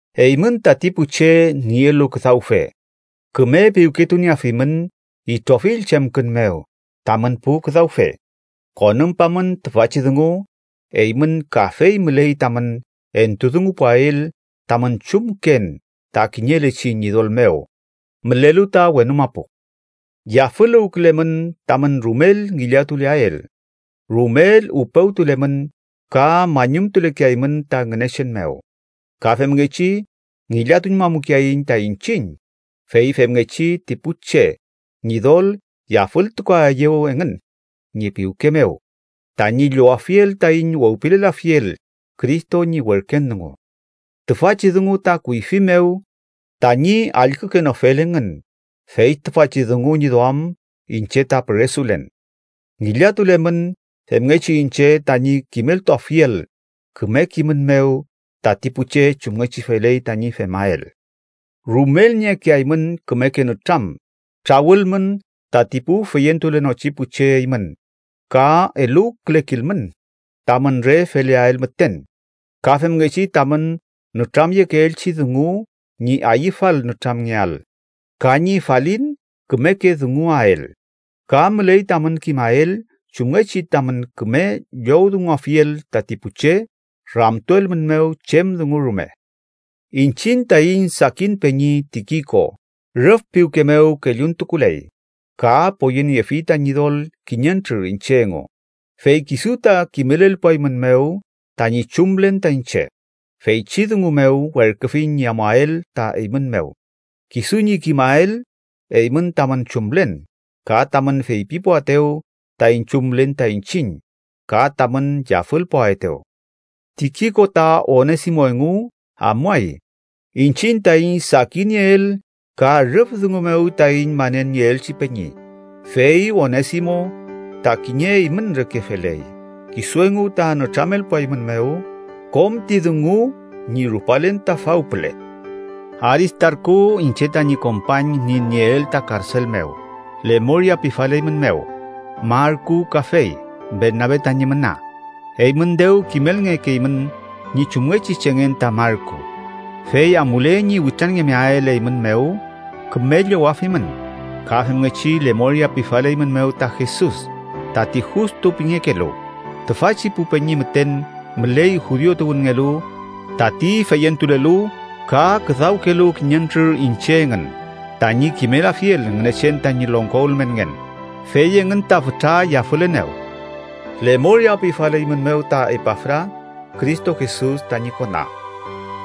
Eymün tati pu che nielu küdawfe, küme piwketunieafimün itrofill chemkün mew tamün pu küdawfe. Konümpamün tüfachi dungu: eymün kafey müley tamün entudungupuael tamün chumken ta kiñelechi Ñidol mew mülelu ta wenu mapu. Yafüluwkülemün tamün rumel ngillatuleael, rumel upewtulemün ka mañumtulekeaymün ta Ngünechen mew. Ka femngechi ngillatuñmamukeaiñ ta iñchiñ, fey femngechi ti pu che Ñidol yafültukuaeyew engün ñi piwke mew tañi llowafiel taiñ wewpilelafiel Cristo ñi werken dungu. Tüfachi dungu ta kuyfi mew tañi allkükenofel engün, fey tüfachi dungu ñi duam iñche ta püresulen. Ngillatulemün femngechi iñche tañi kimeltuafiel küme kimün mew tati pu che chumngechi feley tañi femael. Rumel niekeaymün kümeke nütram trawülmün tati pu feyentulenochi pu che eymün ka eluwkülekilmün tamün re feleael müten. Ka femngechi tamün nütramyekeelchi dungu ñi ayüfal nütramngeael ka ñi falin kümeke dunguael, ka müley tamün kimael chumngechi tamün küme llowdunguafiel tati pu che ramtuelmünmew chem dungu rume. Iñchiñ taiñ sakin peñi Tikiko, rüf piwke mew kelluntukuley ka poyeniefi ta Ñidol kiñentrür iñche engu, fey kisu ta kimelelpuaeymünmew tañi chumlen ta iñche. Feychi dungu mew werküfiñ ñi amuael ta eymün mew, kisu ñi kimael eymün tamün chumlen, ka tamün feypipuaetew taiñ chumlen ta iñchiñ ka tamün yafülpuaetew. Tikiko ta Onesimo engu amuay, iñchiñ taiñ sakinieel ka rüf dungu mew taiñ manelnieelchi peñi, fey Onesimo ta kiñe eymün reke feley. Kisu engu ta nütramelpuaeymünmew kom ti dungu ñi rupalen ta fawpüle. Aristarku iñche tañi kompañ ñi nieel ta karsel mew, lemoria pifaleymünmew; Marku kafey, Bernabe tañi müna. Eymün dew kimelngekeymün ñi chumngechi chengen ta Marku, fey amule ñi witranngemeael eymün mew, küme llowafimün. Ka femngechi lemoria pifaleymünmew ta Jesus, tati Justu pingekelu. Tüfachi pu peñi müten müley judiu tuwünngelu tati feyentulelu ka küdawkülelu kiñentrür iñche engün tañi kimelafiel Ngünechen tañi longko ülmenngen, fey engün ta fütra yafülenew. Lemoria pifaleymünmew ta Epafra Cristo Jesus tañi kona.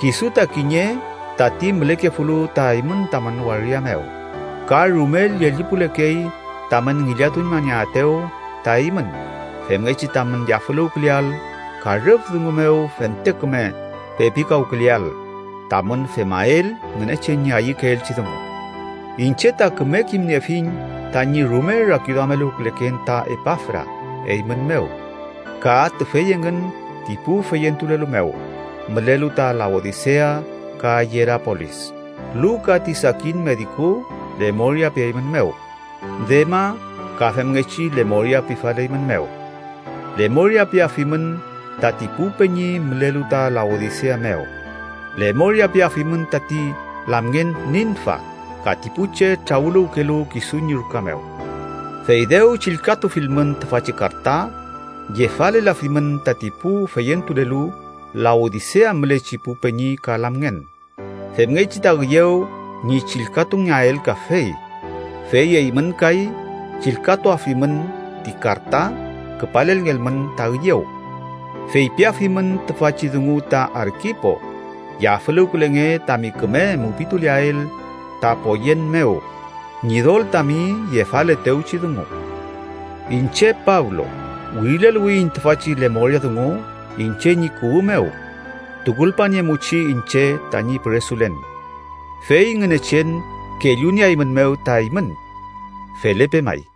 Kisu ta kiñe tati mülekefulu ta eymün tamün waria mew, ka rumel llellipulekey tamün ngillatuñmanieaetew ta eymün femngechi tamün yafüluwküleael ka rüf dungu mew fente küme pepikawküleael tamün femael Ngünechen ñi ayükeelchi dungu. Iñche ta küme kimniefiñ tañi rume rakiduameluwküleken ta Epafra eymün mew ka tüfey engün ti pu feyentulelu mew mülelu ta Laodisea ka Yerapolis. Luka ti sakin mediku lemoria pieymünmew. Dema ka femngechi lemoria pifaleymünmew. Lemoria piafimün tati pu peñi mülelu ta Laodisea mew. Lemoria piafimün tati lamngen Ninfa ka ti pu che trawüluwkelu kisu ñi ruka mew. Fey dew chillkatufilmün tüfachi karta, yefalelafimün tati pu feyentulelu Laodisea mülechi pu peñi ka lamngen, femngechi ta üyew ñi chillkatungeael kafey. Fey eymün kay chillkatuafimün ti karta küpalelngelmün ta üyew. Feypiafimün tüfachi dungu ta Arkipo: “Yafüluwkülenge tami küme mupituleael ta poyen mew Ñidol tami yefaletewchi dungu.” Iñche Pablo, wirileluwiyiñ tüfachi lemoria dungu iñche ñi kuwü mew. Tukulpaniemuchi iñche tañi püresulen. Fey Ngünechen kellunieaeymünmew ta eymün. Felepe may.